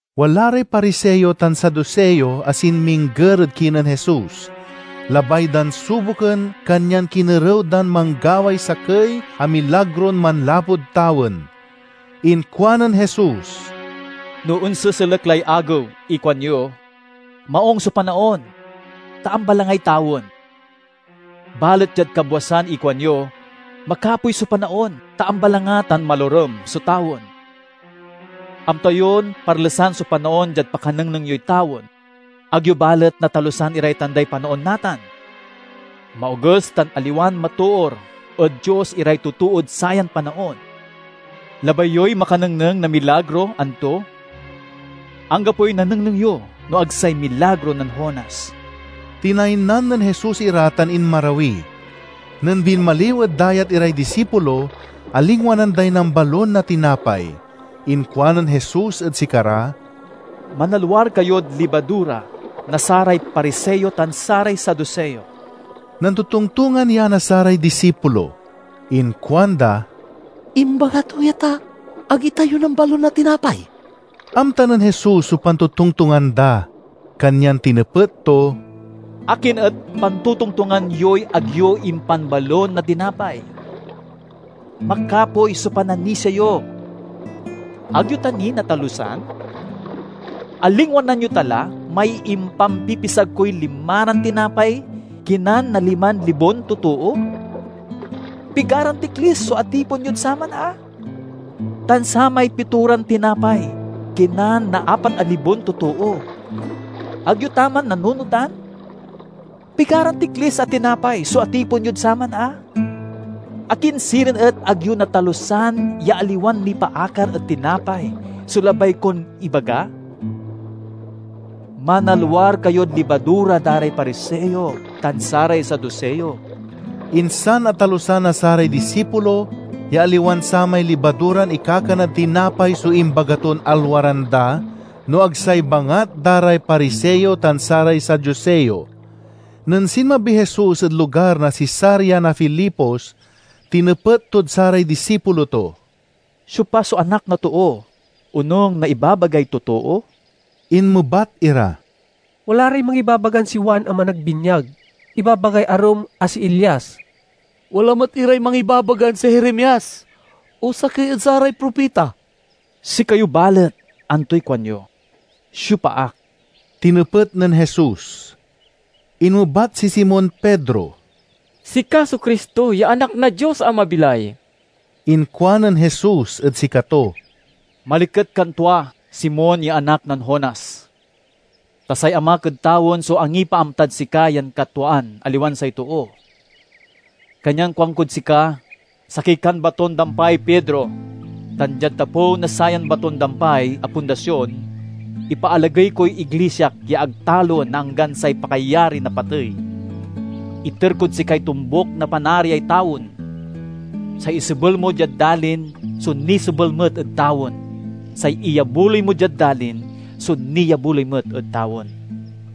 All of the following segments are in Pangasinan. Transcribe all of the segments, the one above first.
Wala ray Pariseo tan Saduseo a sinmingger ed kinen Jesus. Labay dan suboken kanyan kinerew dan manggaway sakey a milagron manlapud tawen. Inkuanen Jesus, "No onseselek lay agew ikuanyo, 'Maung so panaon, ta ambalangay tawen.' Balet diad kabwasan ikuanyo, 'Makapoy so panaon, ta ambalanga tan malorem so tawen.' Amta yon parlesan so panaon diad pakanengneng yoy tawen, ag yo balet natalusan iray tanday panaon natan! Maoges tan aliwan matoor ed Dios iray totood sayan panaon! Labay yoy makanengneng na milagro, anto? Anggapoy nanengneng yo no ag say milagro nen Jonas!" Tinaynan nen Jesus ira tan inmarawi. Nen binmaliw ed dayat iray disipulo, alingwanan day nambalon na tinapay. Inkuanen Jesus ed sikara, "Manalwar kayod libadura na saray Pariseo tan saray Saduseo." Nantotongtongan ya na saray disipulo. Inkuanda, "Imbaga to ya, ta ag itayo nambalon na tinapay." Amta nen Jesus so pantotongtongan da, kanyan tinepet to, "Akin et pantotongtongan yoy ag yo impanbalon na tinapay? Makapoy so pananisia yo! Ag yo ta ni natalusan? Alingwanan yo ta la may impampipisag koy limaran tinapay kinan na liman libon totoo? Pigaran tiklis so atipon yod saman a? Tan samay pitoran tinapay kinan na apat a libon totoo; ag yo ta man nanunotan? Pigaran tiklis a tinapay so atipon yod saman a? Akin sirin et ag yo natalusan ya aliwan nipaakar ed tinapay so labay kon ibaga? Manalwar kayod libadura da ray Pariseo tan saray Saduseo!" Insan atalusan na saray disipulo ya aliwan samay libaduran ikakanad tinapay so imbaga ton alwaran da, no ag say bangat da ray Pariseo tan saray Saduseo. Nen sinmabiy Jesus ed lugar na Cesarea na Filipos tinepet tod saray disipulo to, "Siopa so Anak na Too, onung na ibabagay totoo?" Inmebat ira, "Wala ray mangibabagan si Juan a Managbinyag. Ibabagay arum a si Elias; wala met iray mangibabagan si Jeremias o sakey ed saray propita." "Sikayo balet, antoy kuanyo? Siopa ak?" tinepet nen Jesus. Inmebat si Simon Pedro, "Sika so Cristo ya Anak na Dios a mabilay." Inkuanen Jesus ed sikato, "Maliket kan tua, Simon ya anak nen Jonas! Ta say Amak ed tawen so angipaamtad sika yan katwaan, aliwan say too. Kanyan kuankod sika: sakey kan baton-dampay, Pedro, tan diad tapew na sayan baton-dampay a pundasion, ipaalagey koy iglisiak ya ag taloen na anggan say pakayari na patey. Iter kod sikay tombuk na Panariay tawen. Say isebel mo diad dalin so nisebel met ed tawen; say iyabuloy mo diad dalin so niabuloy met ed tawen."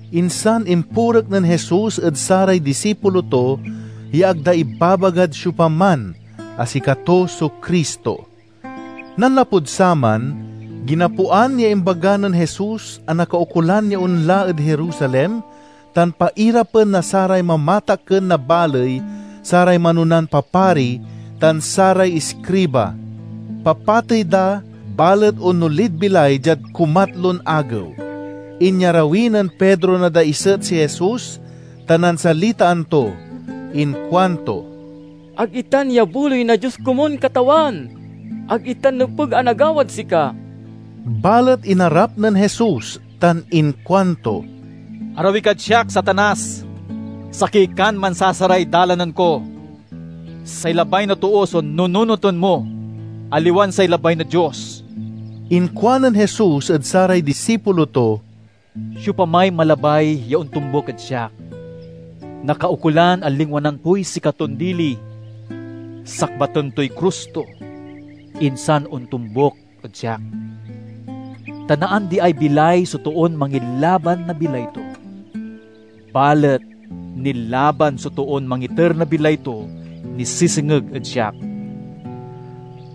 Insan impurek nen Jesus ed saray disipulo to ya ag da ibabagad siopaman a sikato so Cristo. Nanlapud saman, ginapoan ya imbaga nen Jesus a nakaukolan ya onla ed Jerusalem tan pairapen na saray mamatakken na baley, saray manonan papari, tan saray iskriba. Papatey da, balet onolid bilay diad kumatlon agew. Inyarawi nen Pedro na daiset si Jesus tan nansalitaan to. Inkuanto, "Ag itan yabuloy na Dios komun, Katawan! Ag itan nepeg a nagawad sika!" Balet inarap nen Jesus tan inkuanto, "Arawi kad siak, Satanas! Sakey kan mansasaray dalanen ko! Say labay na too so nununoten mo, aliwan say labay na Dios!" Inkuanen Jesus ed saray disipulo to, "Siopamay malabay ya ontombuk ed siak, nakaukolan a lingwanan toy sikaton dili, sakbaten toy krus to, insan ontombuk ed siak. Ta naandiay bilay so toon mangilaban na bilay to; balet nilaban so toon mangiter na bilay to nisesengeg ed siak.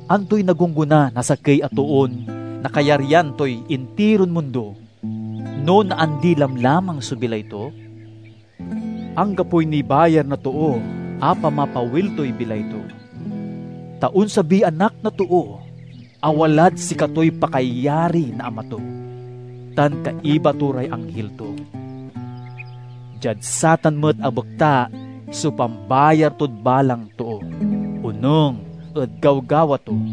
Antoy nagonggona na sakey a toon nakayarian toy intiron mundo, no naandi lamlamang so bilay to? Anggapoy nibayar na too a pamapawil toy bilay to. Ta onsabiy Anak na Too a walad sikatoy pakayari na Ama to, tan kaiba to ray anghil to. Diad satan met a bekta so pambayar tod balang too, onung ed gawgawa to.